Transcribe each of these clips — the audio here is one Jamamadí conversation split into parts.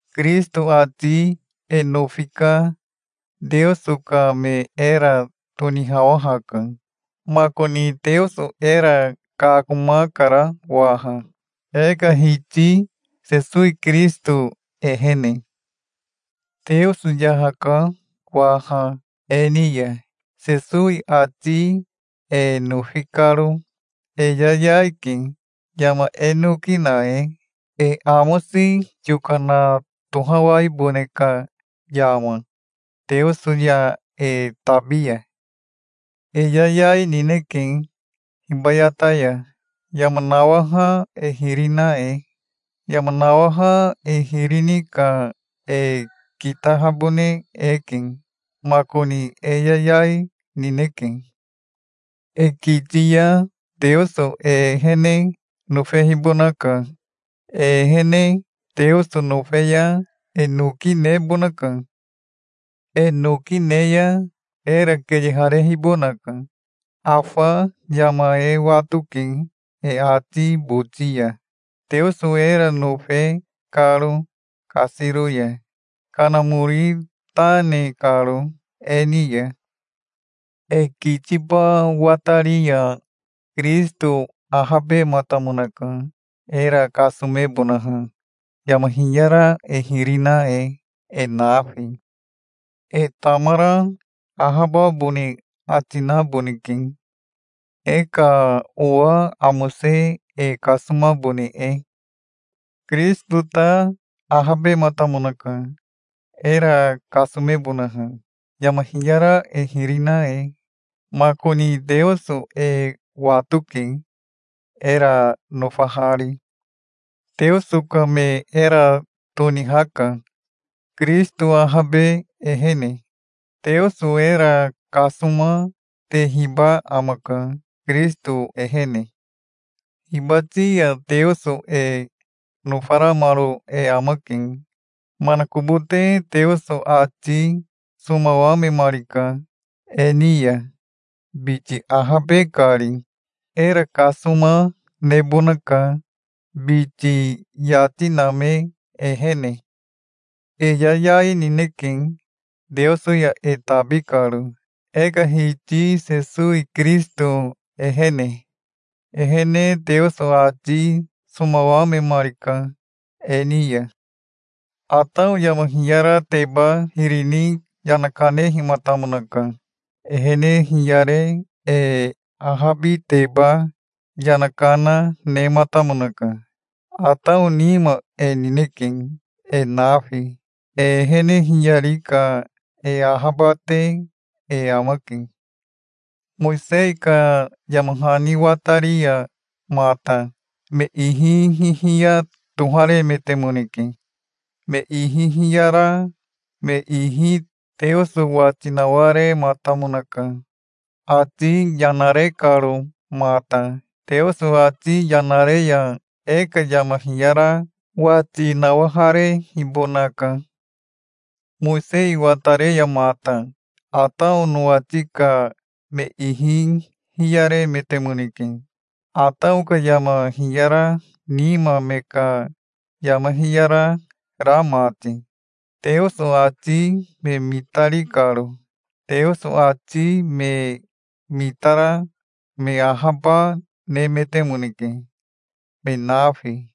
Kirisito ati e nofi ka Teoso ka me era tonihawahaka. Makoni Teoso era kakomakara waha, e ka Hiti Sesowi Kirisito ehene. Teoso yahaka waha e ni ya, Sesowi ati e nofi karo. E yayai ke, yama e noki na e, e amosi yokana tohawaibone ka yama, Teoso ya e tabi ya. E yayai, nineke hibayata ya, yama nawaha e hiri na e. Yama nawaha e hiri ni ka e kitahabone eke. Makoni e yayai nineke. E kiti ya Teoso e ehene nofehibonaka. E ehene Teoso nofe ya e noki nebonaka. E noki ne ya era keyeharehibonaka. Afa yama e watoke e ati boti ya, Teoso era nofe karo kasiro ya, Kanamori ta ne karo e ni ya. E kitiba watari ya Kirisito ahabematamonaka, era kasomebonaha, yama hiyara e hiri na e, e nafi. E tamara ahababone ati naboneke, e ka owa amose e kasomabone e. Kirisito ta ahabematamonaka, era kasomebonaha, yama hiyara e hiri na e. Makoni Teoso e watoke, era nofahari. Teoso ka me era tonihaka, Kirisito ahabe ehene. Teoso era kasoma tehiba amaka, Kirisito ehene. Hibati ya Teoso e nofaramaro e amake. Manakobote Teoso ati somawamemarika e ni ya, biti ahabe kari. Era kasoma nebonaka, biti yati name ehene. E yayai, nineke, Teoso ya e tabi karo, e ka Hiti Sesowi Kirisito ehene. Ehene Teoso ati somawamemarika e ni ya. Atao yama hiyarateba hiri ni yana kanehimatamonaka. Ehene hiyare e ahabiteba yana kana nematamonaka. Atao nima e nineke, e nafi. E ehene hiyari ka e ahabate e amake. Mowisei ka yama hani watari ya mata me ihi hihiya toharemetemoneke. Me ihi hiyara me ihi Teoso wati nawarematamonaka, ati yana re karo mata. Teoso ati yana re ya e ka yama hiyara wati nawaharehibonaka. Mowisei watare ya mata Atao nowati ka me ihi hiyaremetemoneke, Atao ka yama hiyara nima me ka yama hiyara ra mati, Teoso ati me mitari karo. Teoso ati me mitara me ahaba nemetemoneke, me nafi.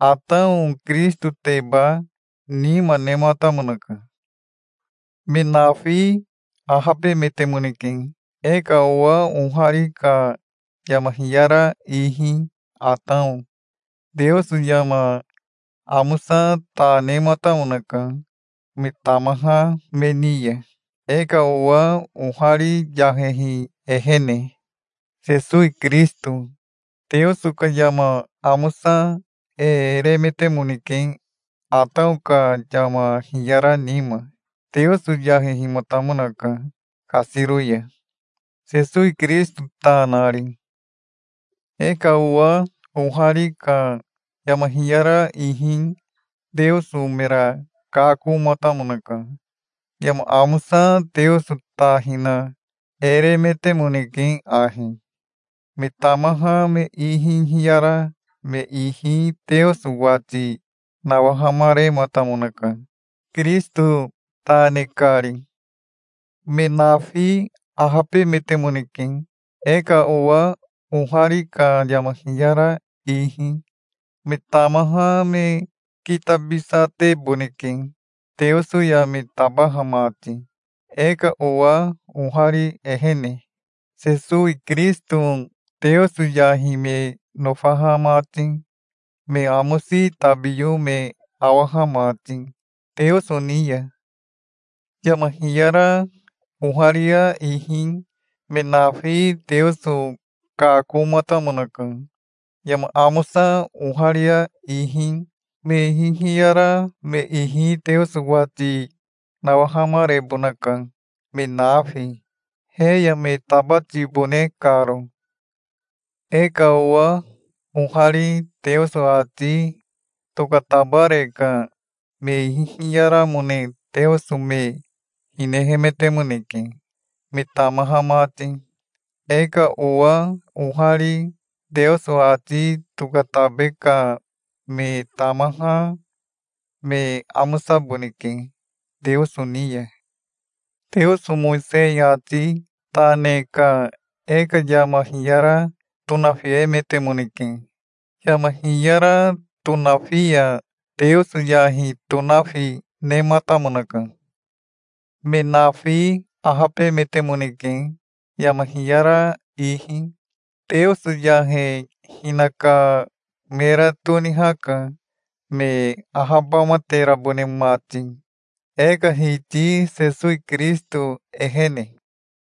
Atao Kirisitoteba nima nematamonaka. Me nafi ahabemetemoneke, e ka owa ohari ka yama hiyara ihi, Atao. Teoso yama amosa ta nematamonaka me tamaha me ni ya, e ka owa ohari yahehi ehene, Sesowi Kirisito. Teoso ka yama amosa e remetemoneke, Atao ka yama hiyara nima. Teoso yahehimatamonaka kasiro ya, Sesowi Kirisito ta nari. E ka owa ohari ka yama hiyara ihi Teoso mera kakomatamonaka. Yama amosa Teoso ta hina e remetemoneke ahi. Me tamaha me ihi hiyara me ihi Teoso wati nawahamarematamonaka, Kirisito ta ne kari. Me nafi ahabemetemoneke, e ka owa ohari ka yama hiyara ihi. Me tamaha me kitabisateboneke Teoso ya me tabaha mati e ka owa ohari ehene, Sesowi Kirisito, Teoso yahi me nofaha mati, me amosi tabiyo me awaha mati Teoso ni ya. Yama hiyara oharia ihi me nafi Teoso kakomatamonaka. Yama amosa oharia ihi me ihi hiyara me ihi Teoso wati nawahamarebonaka, me nafi, he ya me tabatibone karo. E ka owa ohari Teoso ati tokatabare ka me ihi hiyaramone Teoso me hinehemetemoneke, me tamaha mati. E ka owa ohari Teoso ati tokatabe ka me tamaha me amosaboneke Teoso ni ya. Teoso Mowisei ati ta ne ka e ka yama hiyara tonafiemetemoneke. Yama hiyara tonafi ya Teoso yahi tonafi nematamonaka. Me nafi ahabemetemoneke yama hiyara ihi. Teoso yahe hinaka mera tonihaka, me ahabamaterabone mati, e ka Hiti Sesowi Kirisito ehene.